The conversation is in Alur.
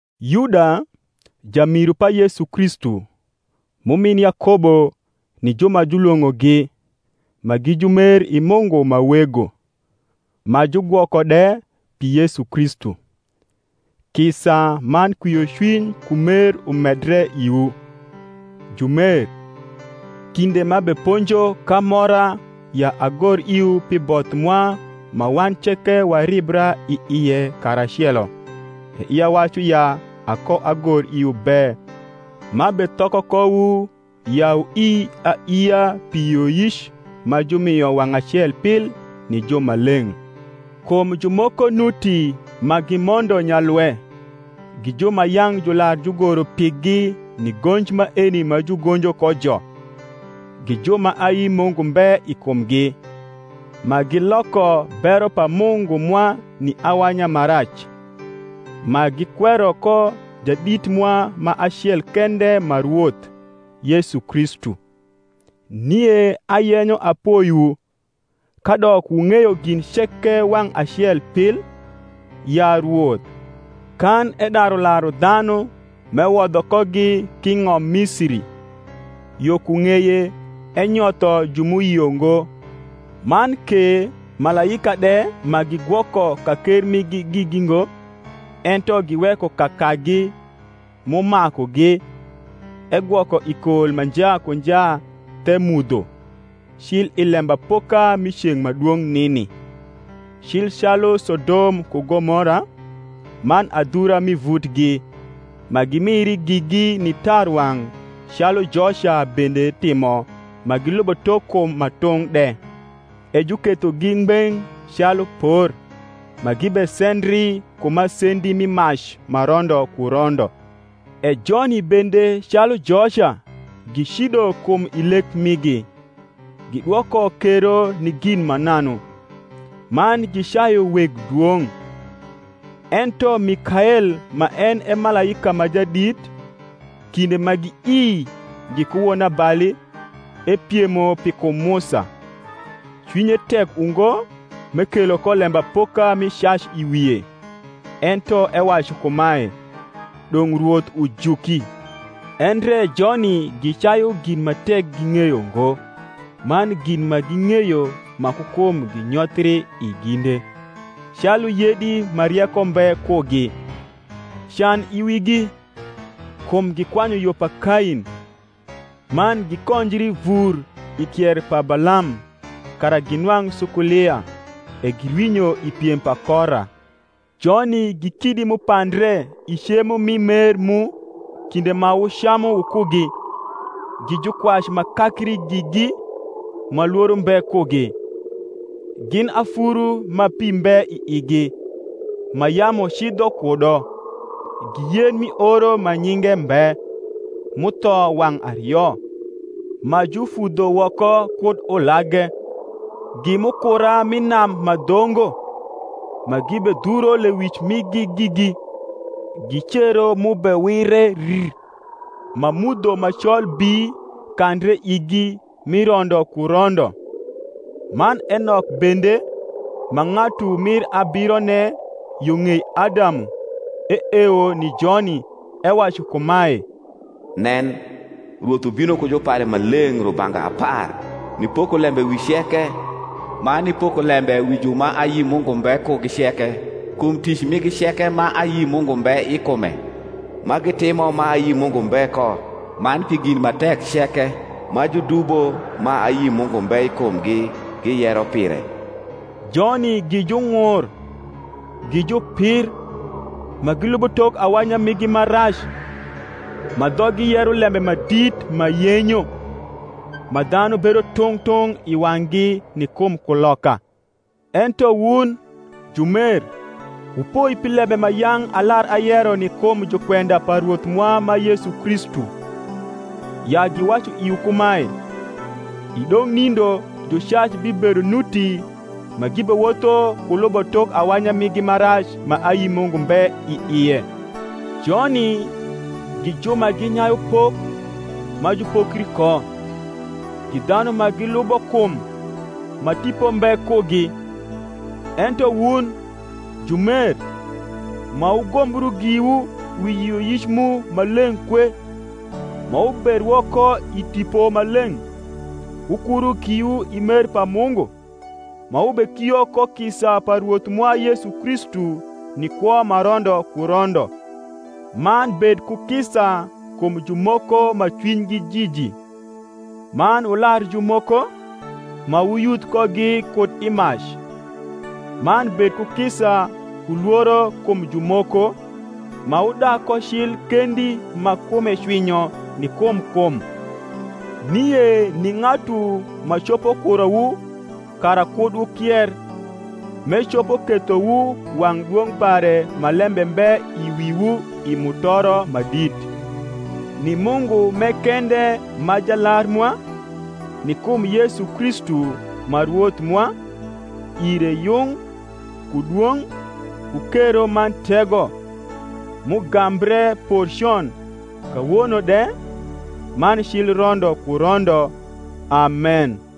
Yuda, jamiru pa Yesu Kristu, m’umin Yakobo ni ju ma julwong’ogi, ma gi jumer i Mungu ma Wego, ma jugwoko de pi Yesu Kristu: Kisa man kwiocwiny ku mer umedre iwu. Jumer, kinde m’abeponjo k’amora ya agor iwu pi both mwa ma wan ceke waribra i ie karacelo, e ia wacu ya akoagor iwu be m’abethoko kowu ya wnii alia pi yioyic ma jumio wang’ acel pil ni jumaleng’. Kum jumoko nuti ma gimondo nyalwe, gi ju ma yang’ jular jugoro pigi ni gonj maeni ma jugonjo kojo, gi ju ma ayi Mungu mbe i kumgi, ma giloko bero pa Mungu mwa ni awanya ma rac, ma gikwero ko Jadit mwa ma acel kende ma Rwoth, Yesu Kristu. Nie ayenyo apoiwu, kadok wung’eyo gin ceke wang’ acel pil, ya Rwoth, kan edaru laru dhanu m’ewodho kogi k’i ng’om Misiri, yo ku ng’eye enyotho ju m’uyio ngo. Man ke malaika de ma gigwoko ka ker migi gigi ngo, ento giweko kakagi m’umakugi, egwoko i kol ma nja ku nja the mudho, cil i lembapoka mi ceng’ ma dwong’ nini. Cil calu Sodom ku Gomora, man adhura m’i vutgi, ma gimiri gigi ni tarwang’ calu joca bende timo ma gilubo tok kum ma tung’ de, e jukethogi ngbeng’ calu por, ma gibesendri ku masendi mi mac ma rondo ku rondo. E joni bende calu joca gicido kum i lek migi, gidwoko kero ni gin mananu, man gicayu weg dwong’. Ento Mikael ma en e malaika ma jadit, kinde ma giii giku wonabali epiemo pi kum Musa, cwinye tek ungo m’ekelo ko lembapoka mi cac i wie, ento ewacu kumae, Dong’ Rwoth ujuki. Endre joni gicayu gin ma tek ging’eyo ngo: man gin ma ging’eyo ma ku kum ginyothri i ginde, calu yedi ma rieko mbe kugi. Can i wigi! kum gikwanyu yo pa Kain, man gikonjri vur i kier pa Balam kara ginwang’ sukulia, e girwinyo i piem pa Kora. Joni gi kidi m’upandre i cemo mi mer mu kinde ma wucamu wukugi, gi jukwac ma kakri gigi ma lworo mbe kugi; gin afuru ma pi mbe i igi, ma yamu cidho kudo; gi yen mi oro ma nyinge mbe, m’utho wang’ ario, ma jufudho woko kud ulage; gi mukura m’i nam ma dhongo, ma gibedhuro lewic migi gigi; gi cero m’ubewire rr, ma mudho ma col bii kandre igi mi rondo ku rondo. Man Enok bende, ma ng’atu mir abirone yo ng’ei Adamu, eewo ni joni, ewacu kumae, Nen, Rwoth ubino ku jupare ma leng’ rubanga apar, nipoko lembe wi ceke, man nipoko lembe wi ju ma ayi Mungu mbe kugi ceke kum tic migi ceke ma ayi Mungu mbe i kume, ma gitimo ma ayi Mungu mbe ko, man pi gin ma tek ceke ma judubo ma ayi Mungu mbe i kumgi giyero pire. Joni gi jung’ur, gi jupir, ma gilubo tok awanya migi ma rac (ma dhoggi yero lembe ma dit ma yenyo) ma dhanu bedo tung’ tung’ i wang’gi ni kum kuloka. Ento wun, jumer, wupoi pi lembe ma yang’ alar ayero ni kum jukwenda pa Rwoth mwa ma Yesu Kristu; ya giwacu iwu kumae, I dong nindo jucac bibedo nuti ma gibewotho ku lubo tok awanya migi ma rac ma ayi Mungu mbe i ie. Joni gi ju ma ginyayu pok ma jupokri ko, gi dhanu ma gilubo kum, ma Tipo mbe kugi. Ento wun, jumer, ma wugombru giwu wi yioyic mu ma leng’ kwe, ma wuberwo ko i Tipo Maleng’, wukuru giwu i mer pa Mungu, ma wubekio ko kisa pa Rwoth mwa Yesu Kristu ni kwo ma rondo ku rondo. Man bed ku kisa kum jumoko ma cwinygi jiji; man wular jumoko, ma wuyudh kogi kud i mac; man bed ku kisa ku lworo kum jumoko; ma wudag ko cil kendi ma kume cwinyo ni kum kum. Nie ni ng’atu ma copo kurowu kara kud wukier, m’ecopo kethowu wang’ dwong’ pare ma lembe mbe i wiwu i mutoro ma dit, ni Mungu m’e kende ma Jalar mwa, ni kum Yesu Kristu ma Rwoth mwa, ire yung, ku dwong’, ku kero man tego, m’ugambre por con, kawono de, man cil rondo ku rondo. Amen.